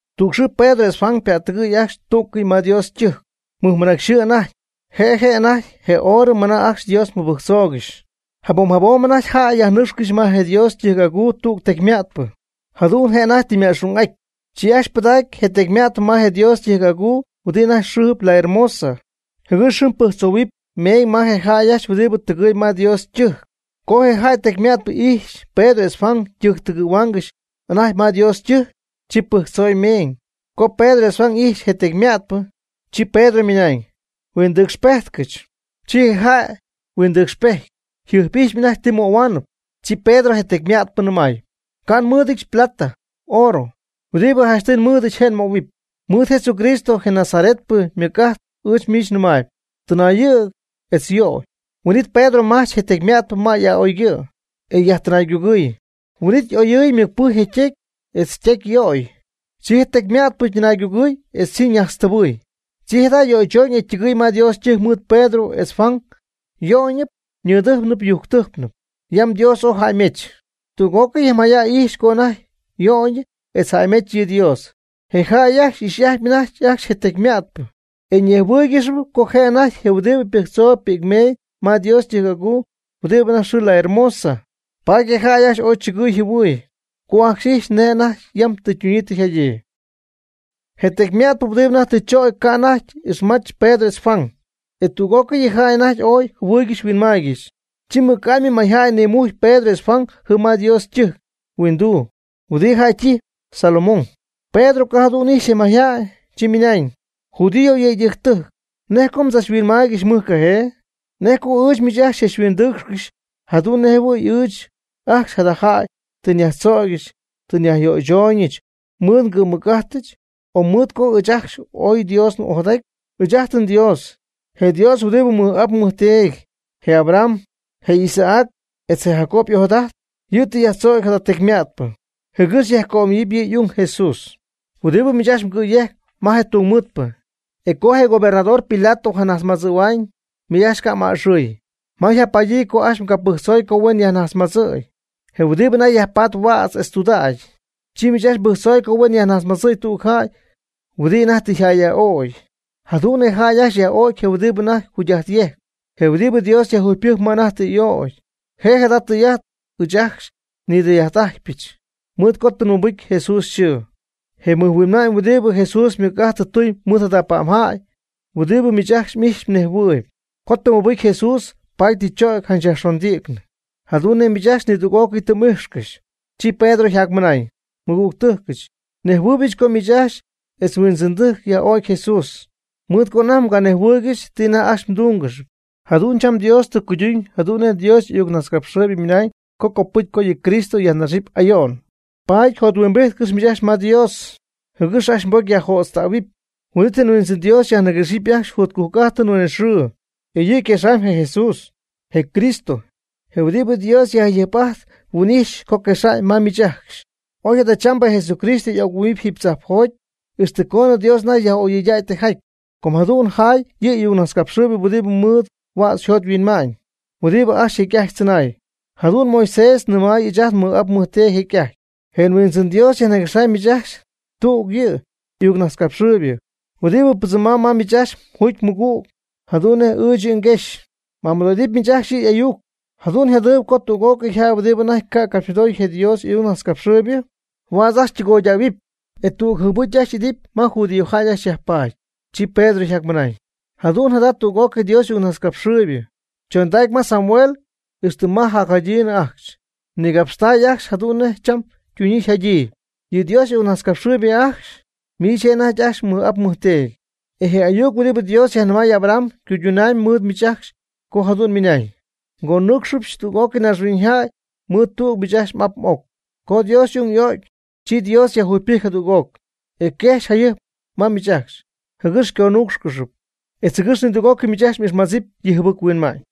Tüg xɨɨ Pedro etz Juan ypättɨgɨ̈y ajcxy tú'cɨy ma Dios ytɨjc, mɨjmɨnacy xɨɨ anajty, je' je' anajty je horɨ mɨna ajcxy Dios mɨbɨjctzoogɨxy. Jabom jabom anajty jäy yajnɨcxcɨxy ma je Dios ytɨjc'aguu tüg tecyma'tpɨ, jadu'n je' anajty tɨ yma'xung'aty. Chi ajcxy pɨdägy je tecyma'tpɨ ma je Dios ytɨjc'aguu huɨdi anajty yxɨɨ la Hermosa, jɨgɨx jɨm pɨjctzohuɨpy meeñ ma je jäy ajcxy huɨdibɨ tɨgɨɨyb ma Dios ytɨjc. Co je jäy tecyma'tpɨ ijxy Pedro etz Juan ytɨgɨ̈huaangɨxy anajty ma Dios ytɨjc, chi pɨjctzoy meeñ. Co Pedro etz Juan ijxy je tecyma'tpɨ, chi Pedro ymɨnañ: ―Huindɨcxpejtcɨch. Chi je jäy huindɨcxpejty, yjɨjp'ijxpy anajty ti möhuaanɨp. Chi Pedro je tecyma'tpɨ nɨmay: ―Ca' nmɨ́ɨdɨdyɨch plata, oorɨ, huɨdibɨ janchtɨy nmɨɨdɨch je' nmöhuɨp. Mɨɨd Jesucristo je Nazaretpɨ ymɨc'ajt ɨɨch miich nɨmaayb: Tɨnaayɨ̈g etz yöy. Huin'it Pedro majch je tecyma'tpɨ ma a'oygɨ', e yajtɨnaygugɨɨy. Huin'ítɨy y'oyɨɨy ymɨcpɨjcy je ytecy etz ytecyyög. Chi je tecyma'tpɨ ytɨnaygugɨɨy etz chi ñajtztɨbɨɨy. Chi jada' yöychoñ e ytɨgɨɨy ma Dios ytɨjc mɨɨd Pedro etz Juan yöyñɨp ñɨdɨjcnɨ yujctɨjcnɨ, yam Dios ooy jäymech. Tüg'ócɨy je mayjäy ijxy co anajty yöyñɨp etz jäymech yɨ Dios. Je jäy ajcxy y'ijxy'ajtpy anajty ajcxy je tecyma'tpɨ e ñejhuɨɨygɨxyp co je' anajty je' huɨdibɨ pɨjtzohuo'cp pi'c meeñ ma Dios ytɨjc'aguu huɨdi anajty yxɨɨ la Hermosa. Paady je jäy ajcxy ooy chɨgɨɨy jɨhuɨɨy, co ajcxy ijxy nej anajty yam tɨ ytunyii tɨ yjadyii. Je tecyma'tpɨ huɨdibɨ anajty tɨ chögy ca' anajty ixmach Pedro etz Juan, e tüg'ócɨy yɨ jäy anajty ooy jɨhuɨɨygɨxy huinmaaygɨxy. Chi mɨc'amy mayjäy nimujcy Pedro etz Juan jɨm ma yɨ Dios ytɨjc huinduu huɨdibɨ jäy ytijpy Salomón. Pedro co jadu'n ijxy je mayjay, chi ymɨnañ: ―Judío yëydɨjctɨjc, ¿nej co mdzachhuinmaaygɨxy mɨjcajee? ¿Nej co ɨɨch miich ajcxy xychachhuindɨɨcxcɨxy jadu'n nej jɨhuɨ̈y ɨɨch ajcxy jada jäy tɨ nyajtzögyɨch tɨ nyajyöychooñɨch mɨɨd ngɨ̈mmɨc'ajtɨch, o mɨɨd co ɨɨch ajcxy ooy nDios'ojadaty? Ɨɨch'ajt nDios, je Dios huɨdi nmɨj'ap nmɨjteedy, je Abraham, je Isaac, etz je Jacob y'ojadajt, yɨ' tɨ yajtzögy jada tecyma'tpɨ, jɨgɨx yajcömayɨpy yɨ' y'ung Jesús huɨdibɨ miich ajcxy mgɨ̈yejc ma je tungmɨɨdpɨ. E co je gobernador Pilato je' najtzmadzɨ̈hua'ñ, miich ajcxy ca' m'aa'axɨɨy. Ma yjapadyii ajcxy mgapɨjctzoy co huen yajnajtzmadzɨ̈y, je huɨdi anajty yajpaatp huädz etz tudägy, chi miich ajcxy mbɨjctzoy co huen yajnajtzmadzɨ̈y tüg jäy huɨdibɨ anajty tɨ yjäyyaj'o'cy. Jadu'n je jäy ajcxy yaj'o'cy je' huɨdibɨ anajty jugy'ajt yejcp. Je huɨdibɨ Dios yajjugypɨjcy ma anajty tɨ y'ögy e jada tɨy'ajt ɨɨch ajcxy nidɨy'ajt'ajtpyɨch. Mɨɨd co tɨ mɨbɨcy Jesús yxɨɨ, je mɨjhuinma'ñ huɨdibɨ Jesús ymɨc'ajt tɨ tuñ mɨɨd jada pa'mjäy huɨdibɨ miich ajcxy m'ijxyp mnejhuɨɨyb. Com tɨ mɨbɨcy Jesús paady tɨ chögy janch yajxondïcnɨ, jadu'n nej miich ajcxy nidüg'ócɨy tɨ m'ijxcɨxy. Chi Pedro yjacmɨnañ: ―Nmɨgügtɨjcɨch, nejhuɨɨybɨch co miich ajcxy etz mhuindzɨndɨjc yaj'o'cy Jesús, mɨɨd co anajty mganejhuɨɨygɨxy ti anajty ajcxy mduungɨxy. Jadu'n cham Dios tɨ cuyduñ jadu'n nej Dios y'ayucnajtzcapxɨɨybɨ ymɨna'ñ co copɨcy co yɨ Cristo yajnaxɨpy ayo'n. Paady játyɨm jothuimbijtcɨx miich ajcxy ma Dios, jɨgɨx ajcxy mbocy yajjötztähuɨpy. Huin'it je Huindzɨn Dios xyajniguexɨpy ajcxy jotcujc'ájtɨn huinɨxɨɨ, e yɨ' quexamb je Jesús, je Cristo, je huɨdibɨ Dios jayɨjp'aty yhuin'ijx co quexa'ñ ma miich ajcxy. Oy jadachambɨ Jesucristo y'oc-huɨ́'mɨpy jiiby tzajpjoty ixtɨ coonɨ Dios anajty yaj'oyɨydäy tijaty, co jadu'n yjaay yɨ' y'ayucnajtzcapxɨɨybɨ huɨdibɨ mɨɨd huädz yjot yhuinma'ñ huɨdibɨ ajcxy jecy'ajty tzɨnay. Jadu'n Moisés nɨmay ɨɨch ajt nmɨj'ap nmɨjteedy jecy'ajty: “Je Huindzɨn Dios xyajniguexaan miich ajcxy tüg yɨ' y'ayucnajtzcapxɨɨybɨ, huɨdibɨ pɨdzɨmamyb ma miich ajcxy mjuugy mmɨgüg jadu'n nej ɨɨch yɨ' xyguejxy. M'amɨdo'idɨpy miich ajcxy yɨ' y'ayuc. Jadu'n yjadɨpy co tüg'ócɨy jäy huɨdibɨ anajty ca' capxymɨdooy je Dios y'ayucnajtzcapxɨɨybɨ, huädz ajcxy ytɨgoydähuɨpy, e tüg jɨɨbɨcy ajcxy idɨpy ma judíojäy ajcxy yajpaady.” Chi Pedro yjacmɨnañ: ―Jadu'n jada tüg'ócɨy Dios y'ayucnajtzcapxɨɨybɨ, chondacy ma Samuel ixtɨ ma jacjadyiinɨ ajcxy, ñigapxtay ajcxy jadu'n nej cham ytuñyii yjadyii. Yɨ Dios y'ayucnajtzcapxɨɨybɨ ajcxy, miich je' anajty ajcxy mmɨj'ap mmɨjteedy. E je ayuc huɨdibɨ Dios yajnɨmay Abraham ycuydunaamyb mɨɨd miich ajcxy co jadu'n ymɨnañ: “Ngonúucxɨbɨch tüg'ócɨy naaxhuiñyjäy mɨɨd tüg miich m'ap m'oc.” Co Dios y'ung y'o'cy, chi Dios yajjugypɨjcy jadüg'oc, e quejxy jayɨjp ma miich ajcxy, jɨgɨx xyconúucxcɨxɨpy, etz jɨgɨx nidüg'ócɨy miich ajcxy m'ixmadzɨpy yɨ mjɨbɨchuinma'ñ.